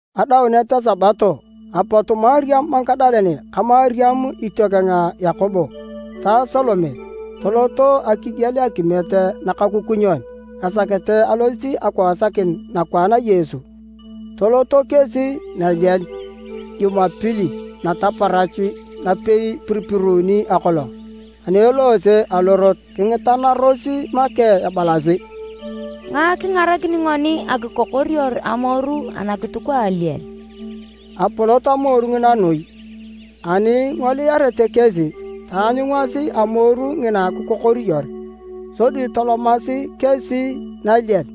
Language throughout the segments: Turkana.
Adaunet a Sabato, apot Mariam Magadalene ka Mariam itiokeng a Yakobo ta Salome toloto akigiel akimiet nakakukunyon esakete alosit akiwasakin nakwaan a Yesu. Toloto kesi naliel Jumapili nataparach napei ipiripiruuni akolong. Ani eloose alorot kingitanaros make ebalasi, “Ngae kingarakini ngoni akikokoriyor amoru anakituk a aliel?” (Apolot amoru ngina noi). Ani ingoliarete kesi, taanyungasi amoru ngina kikokoriyor. Sodi tolomasi kesi naliel,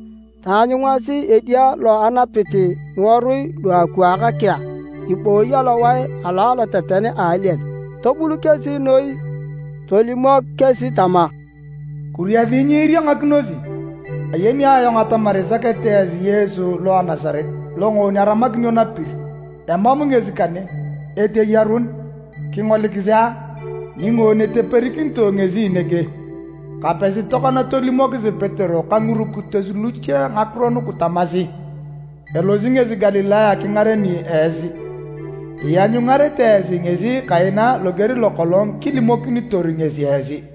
taanyungasi edia lo anapit ngiworui luakwaak kea ibooyi alowae alo aloteten a aliel, tobul kesi noi. Tolimok kesi tama, “Kuriasi nyiiriangakinosi. Ayeni ayong atamar isakete esi Yesu lo a Nasaret, longoon aramakinio napir. Emam ngesi kane, eteyarun! Kingolikisi a, ningoon eteperikinitoe ngesi nege. Kapesi tokona tolimokisi Petero ka ngirukitos luche ngakiro nugu tamasi: ‘Elosi ngesi Galilaya kingareni esi! Ianyungarete esi ngesi kaina loger lokolong kilimokinitor ngesi esi.’”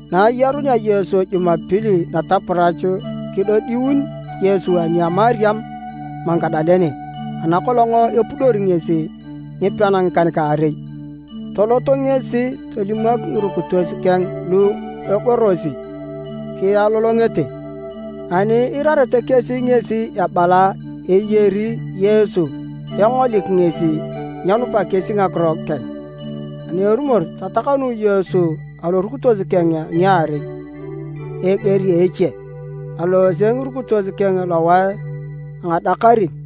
Na ayarunea Yesu Jumapili nataparach, kidodiun Yesu ani a Mariam Magadalene ana kolong epudori ngesi ngipean ngikan-kaarei. Tolot ngesi tolimok ngirukitos keng lu egorosi kialolongete, ani iirarete kesi ngesi ebala eyari Yesu engolik ngesi, nyenupa kesi ngakiro keng. Ani erumor, tatakanu Yesu alorukitos keng a ngiarei a eger a eche. Aloose ngirukitos keng lowae lo a ngadakarin.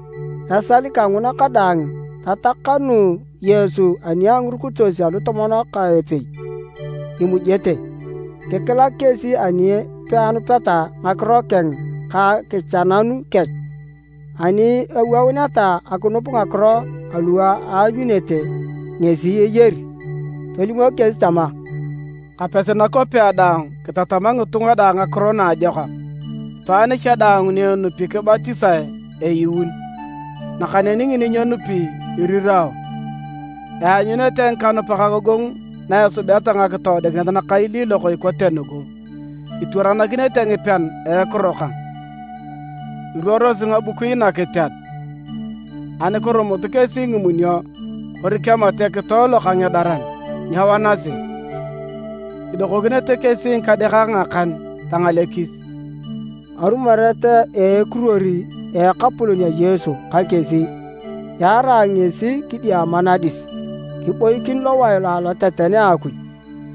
Esal kanguna kadaang tatakanu Yesu ani a ngirukitos alutomon ka epei imujete. Kikilak kesi ani peanupeta ngakiro keng ka akichananu kech ani awouneta akinup ngakiro alu aanyunete ngesi eyari. Tolimok kesi tama, “Kapesi nakwapea daang kitatama ngitunga daang ngakiro naajokak. Itwaan cha daang ni enupi kibatisae eyuun. Nakaneni ngini nyenupi, irirao. Eanyunete ngikanupak agogongu na esubeta ngakitoodikinet nakailiilok ikote nugu, itwaranakinete ngipean a ekiro kang. Iruorosi ngabukui nakiteat, ani kirumut kesi ngimunio kori kemat ekitoe lokangedaran, nyewanasi. Idokokinete kesi ngikadeakak ngakan, tangalekis.” Arumoret a ekiruor a Ekapolon Yesu ka kesi, yaarae ngesi kidiama nadis kiboikin lowae lo a aloteten a Akuj.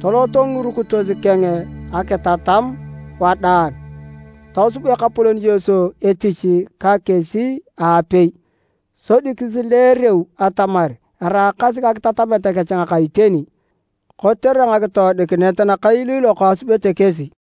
Toloto ngirukitos keng akitatam wadaang. Tosub Ekapolon Yesu etich ka kesi aapei, sodi kisileereu atamar eraakasi ngakitatamet kech ngaka iteni kotere ngakitoodikinet nakailiilok asubete kesi.]